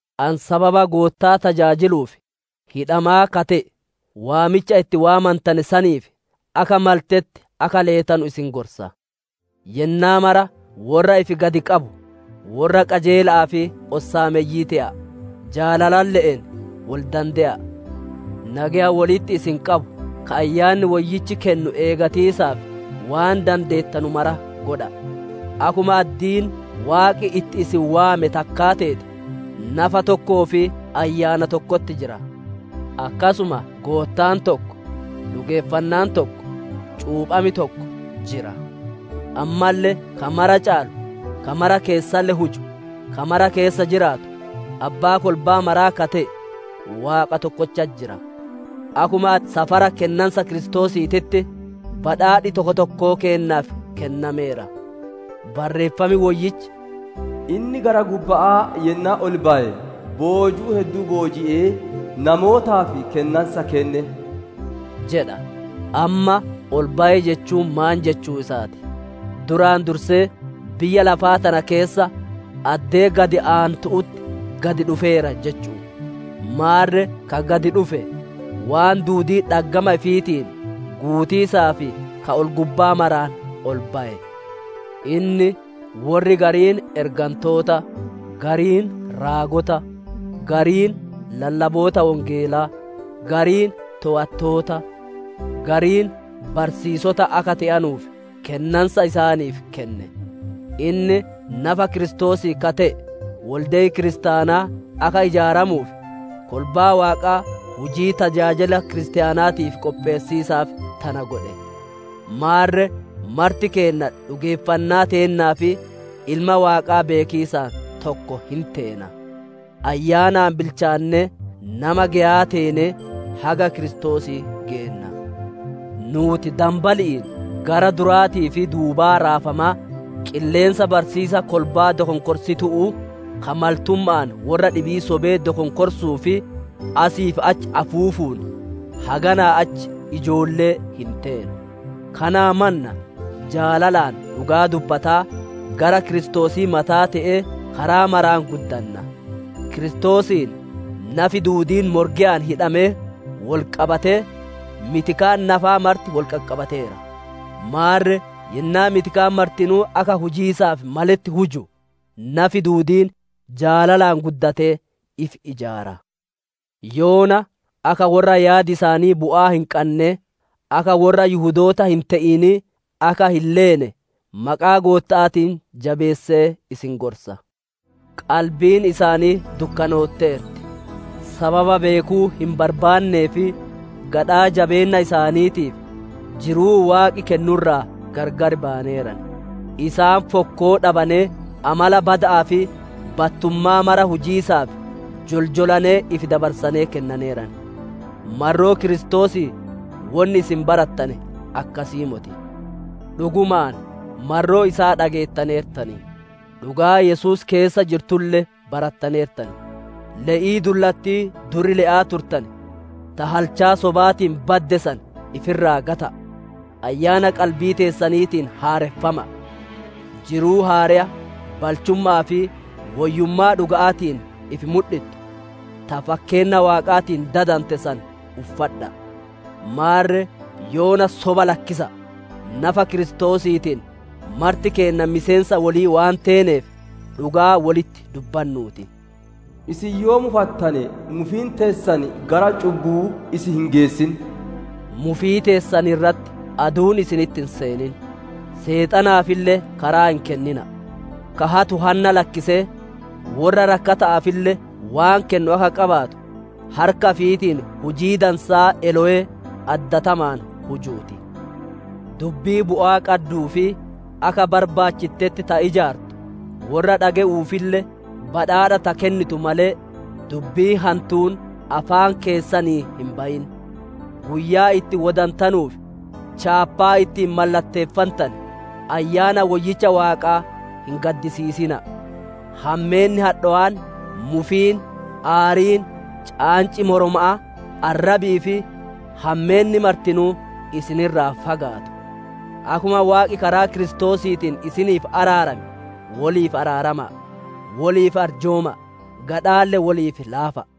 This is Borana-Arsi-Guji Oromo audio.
Ani sababa Goottaa tajaajiluuf hidhamaa ka te'e, waamicha itti waamantane saniif akka maletti akka leetanu isin gorsa. Yennaa mara worra ifi gadi qabu, worra qajeela'aa fi ossaameyyii te'a'a. Jaalalalle'een wol dande'a'a. Nageya wolitti isin qabu ka Ayyaanni Woyyichi kennu eegatiisaaf waan dandeettanu mara godha'a. Akkuma addiin Waaqi itti isin waame takkaa teete, nafa tokkoo fi Ayyaana tokkotti jira. Akkasuma Goottaan tokko, dhugeeffannaan tokko, cuupham tokko jira; ammalle ka mara caalu, ka mara keessalle huju, ka mara keessa jiraatu, Abbaa kolbaa maraa ka te'e, Waaqa tokkochatti jira. Akkuma safara kennansa Kiristoosiititti badhaadhi tokko tokkoo keennaaf kennameera. Barreeffam Woyyichi, «Inni gara gubba'aa yennaa ol baye, boojuu hedduu booji'ee, namootaaf kennansa kenne» jedha. Amma, «Ol baye» jechuun maan jechuu isaa ti? Duraan dursee biyya lafaa tana keessa addee gad aantu'utti gad dhufeera jechu'u. Maarre ka gad dhufe, waan duudii dhaggama ifiitiin guutiisaaf kama ol-gubbaa maraan ol baye. Inni worri gariin ergantoota, gariin raagota, gariin lallaboota Wongeelaa, gariin toowattoota, gariin barsiisota akka te'anuuf kennansa isaaniif kenne. Inni nafa Kiristoosii ka te'e wolde'i kiristaanaa akka ijaaramuuf, kolbaa Waaqaa hujii tajaajila kiristaanaatiif qopheessiisaaf tana godhe. Maarre marti keenna dhugeeffannaa teennaa fi Ilma Waaqaa beekiisaan tokko hin teena; ayyaanaan bilchaannee, nama geyaa teenee, haga Kiristoosii geenna. Nuuti danbali'iin gara duraatii fi duubaa raafamaa, qilleensa barsiisa kolbaa dokonkorsitu'uu, ka maltumma'aan worra dhibii sobee dokonkorsuu fi asii achi afuufuun, haganaa achi ijoollee hin teenu. Kanaa mannaa, jaalalaan dhugaa dubbataa, gara Kiristoosii mataa te'ee, karaa maraan guddanna. Kiristoosiin nafi duudiin morgeyaan hidhamee wol qabatee, mitikaan nafaa marti wol qaqqabateera. Maarre yennaa mitikaan martinuu akka hujiisaaf maletti huju, nafi duudiin jaalalaan guddatee ifi ijaara. Yoona akka worra yaadi isaanii bu'aa hin qannee, akka worra Yihudoota hin te'inii akka hin leene, maqaa Gootta'aatiin jabeessee isin gorsa. Qalbiin isaanii dukkanootteerti; sababa beekuu hin barbaannee fi gadhaa jabeenna isaaniitiif jiruu Waaqi kennu irraa gargar bayaneeran. Isaan fokkoo dhabanee, amala bada'aa fi battummaa mara hujiisaaf joljolanee ifi dabarsanee kennaneeran. Marroo Kiristoosii wonni isin barattane akkasii moti. Dhugumaan marroo isaa dhageettaneertan; dhugaa Yesuus keessa jirtulle barattaneertan. Le'ii dullattii dur le'aa turtane, ta halchaa sobaatiin badde san ifi irraa gata'a. Ayyaana qalbii teessaniitiin haareffama'a. Jiruu haareya, balchumma'aa fi woyyummaa dhuga'aatiin ifi mudhittu, ta fakkeenna Waaqaatiin dadante san uffadha'a. Maarre, yoona soba lakkisa'a! Nafa Kiristoosiitiin marti keenna miseensa wolii waan teeneef, dhugaa wolitti dubbannuu ti. Isin yoo mufattane, mufiin teessan gara cubbuu isin hin geessin; mufii teessan irratti aduun isinitti hin seenin. Seexanaafille karaa hin kennina'a. Ka hatu hanna lakkisee, worra rakkata'aafille waan kennu akka qabaatu, harka ifiitiin hujii dansaa elowee addatamaan hujuu ti. Dubbii bu'aa qadduu fi akka barbaachittetti ta ijaartu, worra dhage'uufille badhaadha ta kennitu malee, dubbiin hantuun afaan keessanii hin bayin. Guyyaa itti wodantanuuf chaappaa ittiin mallatteeffantane, Ayyaana Woyyicha Waaqaa hin gaddisiisina'a. Hammeenni hadhawaan, mufiin, aariin, caanci moroma'aa, arrabii fi hammeenni martinuu isin irraa fagaattu. Akkuma Waaqi karaa Kiristoosiitiin isiniif araarame, woliif araarama'a, woliif arjooma'a, gadhaalle woliif laafa'a.